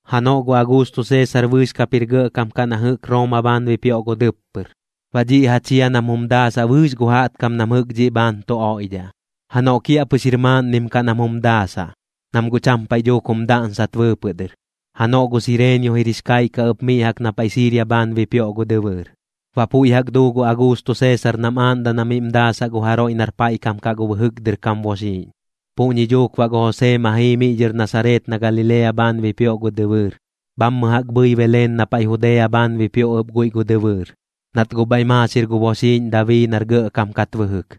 Janoꞌ gu Auguusto Seesar bɨɨx kap jir gɇꞌkam kaꞌ na jɨꞌk Rooma bhaan bipioꞌ gu dɨppɨr, baꞌ dhiꞌ ja chia nam jum daasaꞌ bɨɨx gu jaꞌtkam nam jɨꞌk dhiꞌ bhaan tu oiꞌdhaꞌ. Janoꞌ kiaꞌpɨx jir maaꞌnnim kaꞌ nam jum daasaꞌ, nam guꞌ cham paiꞌ dhuuk jum daꞌnsat bɨɨpɨꞌ dɨr. Janoꞌ gu Sireenio jir jix kaiꞌ kaꞌ ɨp miꞌ jaꞌk na paiꞌ Siiria bhaan bipioꞌ gu dɨbɨɨr. Baꞌ puiꞌ jaꞌk duu gu Auguusto Seesar nam aaꞌndaꞌ na miꞌm daasaꞌ gu jaroiꞌ nar paiꞌ kam kaꞌ gu bɨjɨk dɨr kam boxiiꞌñ. Puꞌñi duuk baꞌ gu Josee ma jii miꞌ dhɨr Nasareet na Galilea bhaan bipioꞌ gu dɨbɨɨr, bhammɨ jaꞌk bhɨi Beleen na paiꞌ Judea bhaan bipioꞌ ɨp guiꞌ gu dɨbɨɨr, nat guꞌ bhaiꞌ maaxir gu boxiiꞌñ Dabii nar gɇꞌkam kat bɨjɨk.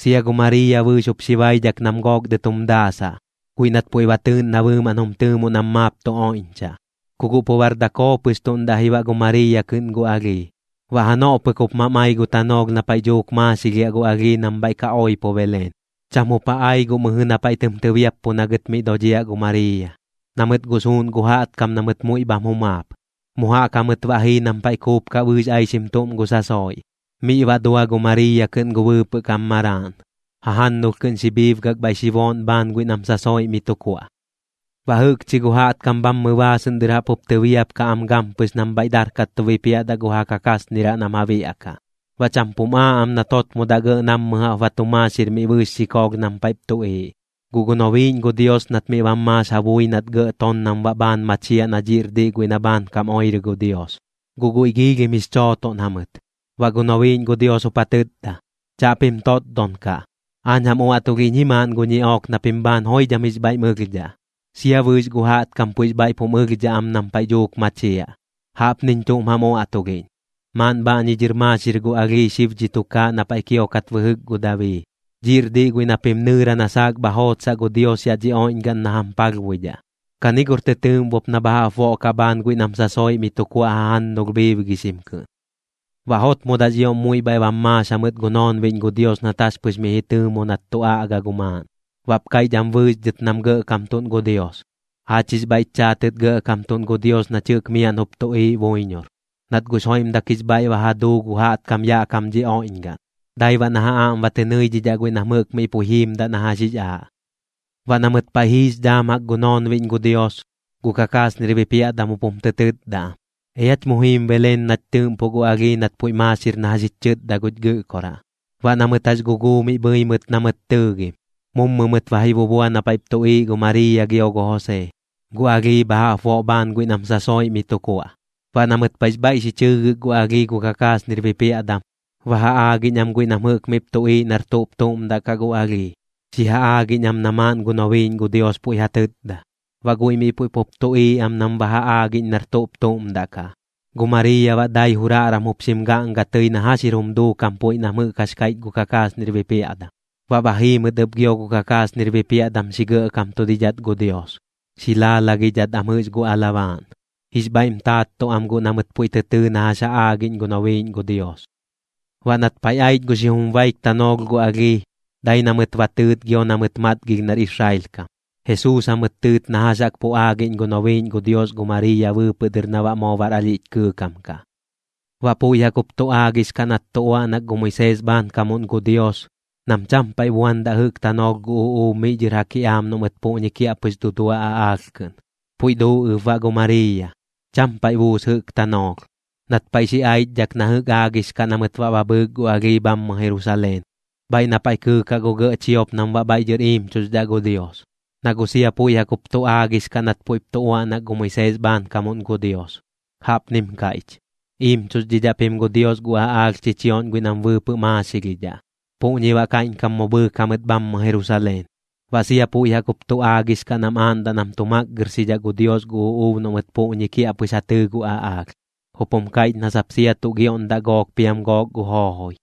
Sia gu Mariiya bɨɨx jup xi baidhak nam gook dɨt jum daasaꞌ, guiꞌ nat puiꞌ ba tɨɨꞌn na bɨɨmaꞌn jum tɨɨmoꞌ nam maap tu oiꞌñchaꞌ. Ku guꞌ pu bar dakoo pɨx tuꞌn daꞌ ji baꞌ gu Mariiya kɨꞌn gu alhii. Baꞌ janoꞌ pɨk jup mam ai gu tanoolh na paiꞌ dhuuk maaxilhiaꞌ gu alhii nam bhaiꞌ ka oipo Beleen. Cham jup ja ai guꞌ mɨjɨ na paiꞌ tɨm tɨbiappu na gɨt miꞌ dodhiaꞌ gu Mariiya, na mɨt guꞌ suuꞌn gu jaꞌtkam na mɨt muiꞌ bham jumaap. Mu jaꞌk jamɨt baꞌ jii nam paiꞌ kuupkaꞌ bɨɨx aixim tuꞌm gu sasoiꞌ. Miꞌ baꞌ dua gu Mariiya kɨꞌn gu bɨɨpɨꞌ kam maraaꞌn, jajannulh kɨꞌn xi bhiibgak bhaiꞌ xi booꞌn bhaan guiꞌ nam sasoiꞌ mi tu kuaꞌ. Baꞌ jɨꞌkchi gu jaꞌtkam bhammɨ baasɨꞌn dɨr jaꞌp jup tɨbiapkaꞌ am gampɨx nam bhaiꞌ darkat tu bipiaꞌdaꞌ gu ja kakasniraꞌ nam ja biaꞌkaꞌ. Baꞌ cham pum aaꞌ am nat jotmodaꞌ gɇꞌ nammɨ jaꞌp ba tu maaxir miꞌ bɨɨx xikoolh nam paiꞌp tuꞌiiꞌ, guꞌ gu nobiiꞌñ gu Dios nat miꞌ bam maax ja bui nat gɇꞌ ton nam baꞌ bhaan machiaꞌ na dhiꞌr diꞌ guiꞌ na bhaankam oirɨ gu Dios. Guꞌ guiꞌ giilhim jix chootoꞌn jamɨt. Baꞌ gu nobiiꞌñ gu Dios jup ja tɨtda: ―Chaꞌpim totdon kaꞌ. Aañ jam uaꞌtulhiꞌñ ji maaꞌn gu ñiꞌook na pim bhaan joidham jix bhaiꞌm ɨlhdhaꞌ, sia bɨɨx gu jaꞌtkam puiꞌx bhaiꞌp jum ɨlhdhaꞌ am nam paiꞌ dhuuk machiaꞌ. Jaꞌpniñ tuꞌm jam uaꞌtulhiꞌñ: Maaꞌn bhaꞌñi dhɨr maaxir gu alhii xib dhi tukaaꞌ na paiꞌ kiokat bɨjɨk gu Dabii. Dhiꞌr diꞌ guiꞌ na pim nɨɨra na saak bha jootsaꞌ gu Dios yaꞌ dhi oiꞌñgaꞌn na jam palhbuidhaꞌ. Kani gor tɨ tɨɨꞌmbop na bha jaꞌp boꞌkaꞌ bhaan guiꞌ nam sasoiꞌ mi tu kuaꞌ jajannulh bhiibgixim kɨꞌn. Baꞌ jotmodaꞌx ioꞌm muiꞌ bhaiꞌ bam maax jamɨt gu noonbiꞌñ gu Dios nat jax pɨx miꞌ ji tɨɨmo nat tu aꞌga gu maaꞌn, baꞌp kaiꞌch am bɨɨx dhɨt nam gɇꞌkamtuꞌn gu Dios: ¡Aach jix bhaiꞌch chaatɨt gɇꞌkamtuꞌn gu Dios nach jɨꞌk miaꞌn jup tuꞌiiꞌ buiñor! Nat guꞌx joiꞌmdak jix bhaiꞌ ba ja duu gu jaꞌtkam yaꞌ kam dhi oiꞌñgaꞌn, dai baꞌ na ja aꞌm ba tɨ nɨidhidhaꞌ guiꞌ nam jɨꞌk miꞌ puiꞌ jiimdaꞌ na jax jix aaꞌ. Baꞌ na mɨt paiꞌ jiix dhaam jaꞌk gu noonbiꞌñ gu Dios, gu kakasnir bipiaꞌdam jup jum tɨ tɨtda am: ―Each mu jiim Beleen nach tɨɨꞌmpoꞌ gu alhii nat puiꞌ maaxir na jax jich chɨtda guch Gɨꞌkoraꞌ. Baꞌ na mɨt jax guguu miꞌ bhɨi mɨt na mɨt tɨɨgim. Mummɨ mɨt ba ji bubua na paiꞌp tuꞌiiꞌ gu Mariiya gio gu Josee, gu alhii bha jaꞌp boꞌ bhaan guiꞌ nam sasoiꞌ mi tu kuaꞌ. Baꞌ na mɨt paiꞌx bhaiꞌ xi chɨɨgɨk gu alhii gu kakasnir bipiaꞌdam, ba ja aagiꞌñ am guiꞌ nam jɨꞌk miꞌp tuꞌiiꞌ nar tuꞌp tuꞌm daꞌ kaꞌ gu alhii, xi ja aagiꞌñ am na maaꞌn gu nobiiꞌñ gu Dios puiꞌ ja tɨtda. Baꞌ guiꞌ miꞌ puiꞌ pup tuꞌiiꞌ am nam ba ja aagiꞌñ nar tuꞌp tuꞌm daꞌ kaꞌ. Gu Mariiya baꞌ dai juraꞌram jup xim gaꞌnga tɨi na jax jir jum duukam puiꞌ nam jɨꞌk jax kaiꞌch gu kakasnir bipiaꞌdam. Baꞌ ba jii mɨt ɨp gio gu kakasnir bipiaꞌdam xi gɇꞌkamtudidhat gu Dios, xi laalagidhat am jɨꞌx gu alabaaꞌn, jix bhaiꞌm taattuꞌ am guꞌ na mɨt puiꞌ tɨ tɨɨ na jax ja aagiꞌñ gu nobiiꞌñ gu Dios. Baꞌ nat paiꞌ aich gu xijum baik tanoolh gu alhii, dai na mɨt ba tɨɨt gio na mɨt matgilh nar Israel kam. Jesuus jamɨt tɨɨt na jax jaꞌk pu aagiꞌñ gu nobiiꞌñ gu Dios gu Mariiya bɨɨpɨꞌ dɨr na baꞌ moo bar alhiꞌch kɨɨkam kaꞌ. Baꞌ puiꞌ jaꞌk jup tu aagix kaꞌ nat tu uaꞌnak gu Moisees bhaankamuꞌn gu Dios, nam cham paiꞌ buandaꞌ jɨꞌk tanoolh gu uꞌuub miꞌ dhɨr ja kiꞌaam noꞌ mɨt puꞌñi kiaꞌpɨx dudua aꞌaalh kɨꞌn. Puiꞌ duu ɨp baꞌ gu Mariiya, cham paiꞌ buus jɨꞌk tanoolh. Nat paiꞌ xi aichdhak na jɨꞌk aagix kaꞌ na mɨt baꞌ ba bhɨɨk gu alhii bhammɨ Jerusaleen, bhaiꞌ na paiꞌ kɨɨkaꞌ gu gɇꞌ chiop nam baꞌ bhaiꞌ dhɨr iimchuxdhaꞌ gu Dios. Na guꞌ sia puiꞌ jaꞌk jup tu aagix kaꞌ nat puiꞌp tu uaꞌnak gu Moisees bhaankamuꞌn gu Dios. Jaꞌpnim kaiꞌch: “Iimchuxdhidhaꞌ pim gu Dios gu aꞌaalh chichioꞌñ guiꞌ nam bɨɨpɨꞌ maaxilhidhaꞌ.” Puꞌñi baꞌ kaiꞌñkam mu bhɨɨk jamɨt bhammɨ Jerusaleen. Baꞌ sia puiꞌ jaꞌk jup tu aagix kaꞌ nam aaꞌndaꞌ nam tu makgɨrxidhaꞌ gu Dios gu uꞌuub noꞌ mɨt puꞌñi kiaꞌpɨx ja tɨɨ gu aꞌaalh, jup jum kaiꞌch na sap sia tuꞌ gioꞌndaꞌ gook piam gook gu joojoi.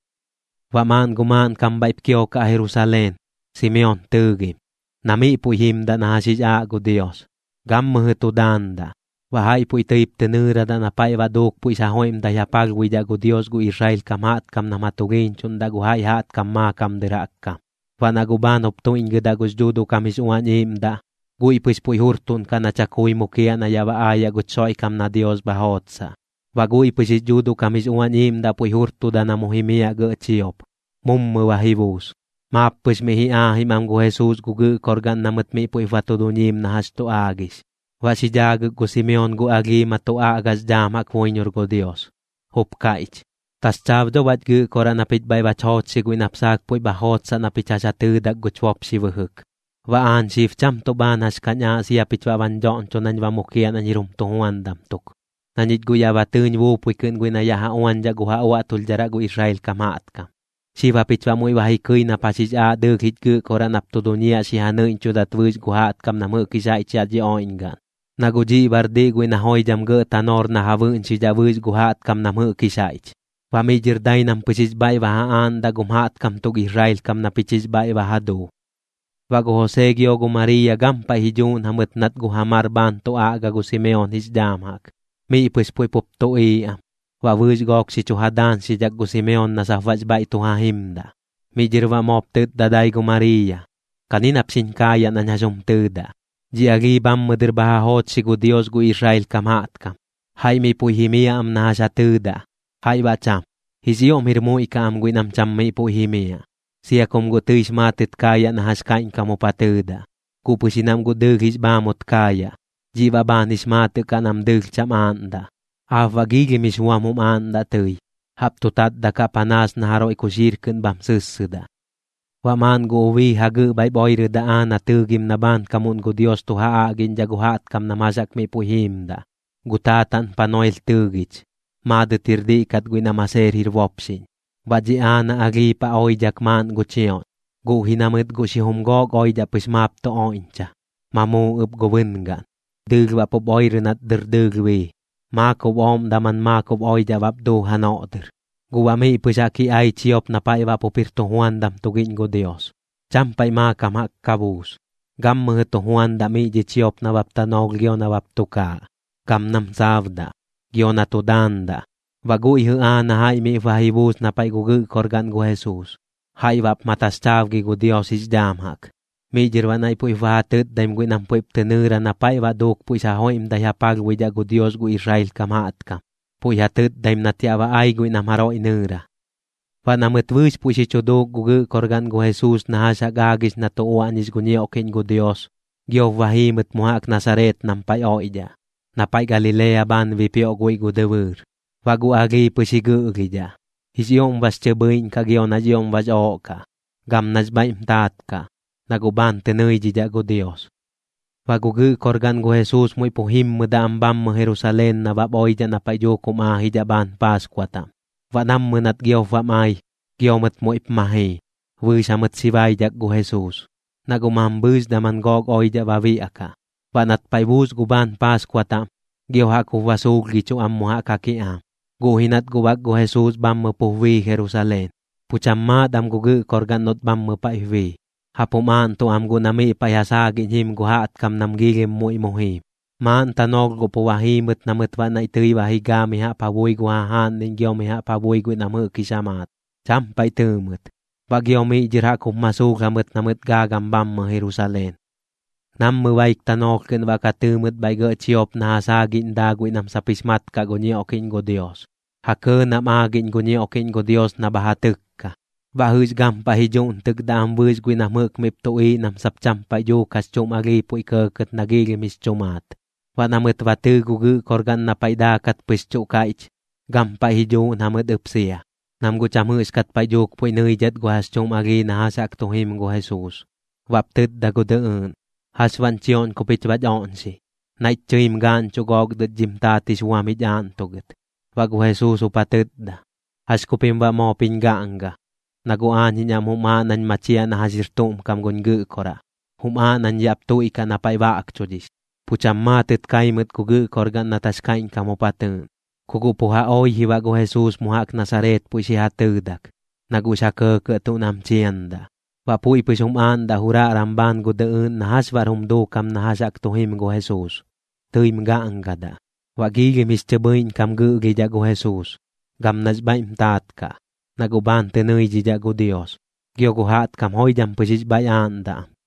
Baꞌ maaꞌn gu maaꞌnkam bhaiꞌp kiokaꞌ Jerusaleen, Simeon tɨɨgim, na miꞌ puiꞌ jimdaꞌ na jax jix aaꞌ gu Dios, gammɨjɨ tu daandaꞌ. Baꞌ jaiꞌ puiꞌ tɨip tɨ nɨɨradaꞌ na paiꞌ baꞌ duuk puiꞌx ja joiꞌmdai ja palhbuidhaꞌ gu Dios gu Israel kam jaꞌtkam nam ja tulhiiñchuꞌndaꞌ gu jaiꞌ jaꞌtkam maakam dɨr jaꞌk kam. Baꞌ na guꞌ bhaan jup tuiꞌñgɨdaꞌ gux Dhuuduꞌ kam jix Uañ Iiꞌmdaꞌ, guiꞌ pɨx puiꞌ jurtuꞌnkaꞌ na chakui mukiaꞌ na yaꞌ ba aayaꞌ guch Xoiꞌkam na Dios bha jootsaꞌ. Baꞌ guiꞌ pɨx jix Dhuuduꞌ kam jix Uañ Iiꞌmdaꞌ puiꞌ jurtuda na mu jimiaꞌ gɇꞌ chiop, mummɨ ba ji buus. Maap pɨx miꞌ ji aajim am gu Jesuus gu gɨꞌkorgaꞌn na mɨt miꞌ puiꞌp ba tu duñiim na jax tu aagix. Baꞌ xi dhaagɨk gu Simeon gu alhii ma tu aꞌgax dhaam jaꞌk buiñor gu Dios, jup kaiꞌch: Taxchaab dho baꞌch Gɨꞌkoraꞌ na pich bhaiꞌ bach joochxi guiꞌ nap saak puiꞌ bha jootsaꞌ na pich jax ja tɨɨdak guch bopxi bɨjɨk. Baꞌ aañ xib cham tuꞌ bhaan jax kañ aaꞌ sia pich baꞌ bañ dhoꞌñcho nañ ba mukiaꞌ nañ jir jum tujuandam tuk, na ñich guꞌ yaꞌ ba tɨɨñ buupui kɨꞌn guiꞌ na yaꞌ ja uañdhaꞌ gu ja uaꞌtulhdharaꞌ gu Israel kam jaꞌtkam. Xib japich baꞌ muiꞌ ba ji kɨi nap jax jix aaꞌ dɨɨlh jich Gɨꞌkoraꞌ nap tu duñiaꞌ xi ja nɨiꞌñchudat bɨɨx gu jaꞌtkam nam jɨꞌk jix jaiꞌch yaꞌ dhi oiꞌñgaꞌn. Na guꞌ dhiꞌ baꞌr diꞌ guiꞌ na joidham gɇꞌ tanoor na ja bɨꞌñxidhaꞌ bɨɨx gu jaꞌtkam nam jɨꞌk jix jaiꞌch, baꞌ miꞌ dhɨr dai nam pɨx jix bhaiꞌ ba ja aaꞌndaꞌ gum jaꞌtkam tuk Israel kam na pich jix bhaiꞌ ba ja duu. Baꞌ gu Josee gio gu Mariiya gampaiꞌ ji dhuuꞌn jamɨt nat gu ja mar bhaan tu aꞌga gu Simeon jix dhaam jaꞌk, miꞌ pɨx puiꞌ pup tuꞌiiꞌ am. Baꞌ bɨɨx gook xi chu ja daañxidhak gu Simeon na sap baꞌx bhaiꞌ tu ja jimdaꞌ. Miꞌ dhɨr baꞌ moop tɨtda dai gu Mariiya: ―Kani nap xiñ kaayaꞌ nañ jax jum tɨɨdaꞌ. Dhi alhii bhammɨ dɨr bha ja joochxi gu Dios gu Israel kam jaꞌtkam. Jaiꞌ miꞌ puiꞌ jimiaꞌ am na jax ja tɨɨdaꞌ, jaiꞌ baꞌ cham. Jix ioꞌm jir muiꞌ kaꞌ am guiꞌ nam cham miꞌ puiꞌ jimiaꞌ, sia kum guꞌ tɨix maatɨt kaayaꞌ na jax kaiꞌñkam jup ja tɨɨdaꞌ, guꞌ pɨx ji nam guꞌ dɨɨlh jix bhaamut kaayaꞌ, dhiꞌ baꞌ bhaan jix maatɨꞌ kaꞌ nam dɨɨlh cham aaꞌndaꞌ. Aap baꞌ giilhim jix buam jum aaꞌndaꞌ tɨi, jaꞌp tu tatdakaꞌ panaas na jaroiꞌ kuxiir kɨꞌn bham sɨssɨdaꞌ. Baꞌ maaꞌn gu ubii jagɨꞌ bhaiꞌp oirɨdaꞌ Aana tɨɨgim na bhaankamuꞌn gu Dios tu ja aꞌgiꞌñdhaꞌ gu jaꞌtkam nam jax jaꞌk miꞌ puiꞌ jiimdaꞌ. Gu taataꞌn Panuel tɨɨgich, maadɨt jir diꞌ kat guiꞌ nam Aseer jir bopxiꞌñ. Baꞌ dhi Aana alhii paꞌ oidhak maaꞌn gu chioꞌñ, guꞌ ji na mɨt guꞌ xijum gook oidhaꞌ pɨx maap tu oiꞌñcha, ma muu ɨp gu bɨngaꞌn. Dɨɨlh baꞌ pup oirɨ nat dɨr dɨɨlh bii, maakob ooꞌm daman maakob oidhaꞌ bap duu janoꞌ dɨr. Guꞌ baꞌ miꞌ pɨx jaꞌk ji ai chiop na paiꞌ baꞌ pup jir tujuandam tugiꞌñ gu Dios, cham paiꞌ maakam jaꞌk ka buus. Gammɨjɨ tu juandaꞌ miꞌ dhi chiop nabap tanoolh gio nabap tukaaꞌ, gam nam saabdaꞌ, gio na tu daandaꞌ. Baꞌ guiꞌ jɨꞌ Aana jaiꞌ miꞌp ba ji buus na paiꞌ gu gɨꞌkorgaꞌn gu Jesuus, jaiꞌ baꞌp ma taxchaabgi gu Dios jix dhaam jaꞌk. Miꞌ dhɨr baꞌ naiꞌ puiꞌp ba ja tɨtdaim guiꞌ nam puiꞌp tɨ nɨɨra na paiꞌ baꞌ duuk puiꞌx ja joiꞌmdai ja palhbuidhaꞌ gu Dios gu Israel kam jaꞌtkam, puiꞌ ja tɨtdaim nat yaꞌ ba ai guiꞌ nam jaroiꞌ nɨɨra. Baꞌ na mɨt bɨɨx puiꞌ xi chu duuk gu gɨꞌkorgaꞌn gu Jesuus na jax jaꞌk aagix na tu uaꞌñix gu ñiokiꞌñ gu Dios, giop ba jii mɨt mu jaꞌk Nasareet nam paiꞌ oiꞌdhaꞌ, na paiꞌ Galilea bhaan bipioꞌ guiꞌ gu dɨbɨɨr. Baꞌ gu alhii pɨx ji gɨꞌlhidhaꞌ, jix ioꞌm bax chɨ bhɨiꞌñ kaꞌ gio nax ioꞌm bax ooꞌ kaꞌ, gam nax bhaiꞌm taat kaꞌ, na guꞌ bhaan tɨ nɨidhidhaꞌ gu Dios. Baꞌ gu gɨꞌkorgaꞌn gu Jesuus muiꞌ pu jimmɨdaꞌ am bhammɨ Jerusaleen nabap oidhaꞌ na paiꞌ dhuuk jum aajidhaꞌ bhaan Paaskua taꞌm. Baꞌ nammɨ nat giop bam ai, gio mɨt muiꞌp ma jii, bɨɨx jamɨt xi baidhak gu Jesuus, na guꞌ mambhɨɨx daman gook oidhaꞌ ba biaꞌkaꞌ. Baꞌ nat paiꞌ buus gu bhaan Paaskua taꞌm, gio jaꞌk jup ba suulhgichuꞌ am mu jaꞌk ja kiꞌaam, guꞌ ji nat guꞌ bak gu Jesuus bhammɨ pup bii Jerusaleen. Pu cham maat am gu gɨꞌkorgaꞌn noꞌt bhammɨ paiꞌp bii, jaꞌp jum aaꞌntuꞌ am guꞌ na miꞌ paiꞌ ja saagiꞌñ jim gu jaꞌtkam nam giilhim muiꞌ mu jiim. Maaꞌn tanoolh guꞌ pu ba jii mɨt na mɨt baꞌ naiꞌ tɨi ba ji gaa mi jaꞌp ja bui gu jajaaꞌnniꞌñ gio mi jaꞌp ja bui guiꞌ nam jɨꞌk jix ja maat. Cham paiꞌ tɨɨ mɨt. Baꞌ gio miꞌ dhɨr jaꞌk jup ma suulh jamɨt na mɨt gaagam bhammɨ Jerusaleen. Nammɨ baik tanoolh kɨꞌn baꞌ ka tɨɨ mɨt bhaiꞌ gɇꞌ chiop na ja saagiꞌñ daa guiꞌ nam sap jix mat kaꞌ gu ñioꞌkiꞌñ gu Dios, ja kɇɇ nam aagiꞌñ gu ñioꞌkiꞌñ gu Dios na bha ja tɨkka. Baꞌ jɨꞌx gampaiꞌ ji dhuꞌntɨkdaꞌ am bɨɨx guiꞌ nam jɨꞌk miꞌp tuꞌiiꞌ nam sap cham paiꞌ dhuuk jax chuꞌm alhii puiꞌ kɇɇkɇt nax ioꞌm jix chu maat. Baꞌ na mɨt ba tɨɨ gu gɨꞌkorgaꞌn na paiꞌ daakat pɨx chuꞌ kaiꞌch, gampaiꞌ ji dhuuꞌn jamɨt ɨp sia, nam guꞌ cham jɨꞌxkat paiꞌ dhuuk puiꞌ nɨidhat gu jax chuꞌm alhii na jax jaꞌk tu jim gu Jesuus. Baꞌp tɨtda gu dɨꞌɨɨꞌn: ―¿Jax baꞌñ chioꞌñ ku pich baꞌch oꞌñxi? Naiꞌch chɨim gaaꞌñchuꞌ gook dɨt dhim taat jix buam jich aaꞌntugɨt. Baꞌ gu Jesuus jup ja tɨtda: ―¿Jax ku pim baꞌ moop jiñ gaꞌnga? Na guꞌ aañ jiñ aꞌm jum aaꞌ nañ machiaꞌ na jax jir tuꞌm kam guñ Gɨꞌkoraꞌ. Jum aaꞌ nañ yaꞌp tuiꞌkaꞌ na paiꞌ baꞌkchudhix. Pu cham maatɨt kai mɨt gu gɨꞌkorgaꞌn nat jax kaiꞌñkam jup ja tɨɨꞌn. Ku guꞌ pu ja oi ji baꞌ gu Jesuus mu jaꞌk Nasareet puiꞌ xi ja tɨɨdak, na guꞌx ja kɇɇkɇꞌ tuꞌ nam chiandaꞌ. Baꞌ puiꞌ pɨx jum aaꞌndaꞌ juraꞌram bhaan gu dɨꞌɨɨꞌn na jax baꞌr jum duukam na jax jaꞌk tu jim gu Jesuus, tɨim gaꞌngadaꞌ. Baꞌx chɨ bhɨiꞌñ kam gɨꞌlhidhaꞌ gu Jesuus, gam nax bhaiꞌm taat kaꞌ, na guꞌ bhaan tɨ nɨidhidhaꞌ gu Dios, gio gu jaꞌtkam joidham pɨx jix bhaiꞌ aaꞌndaꞌ am.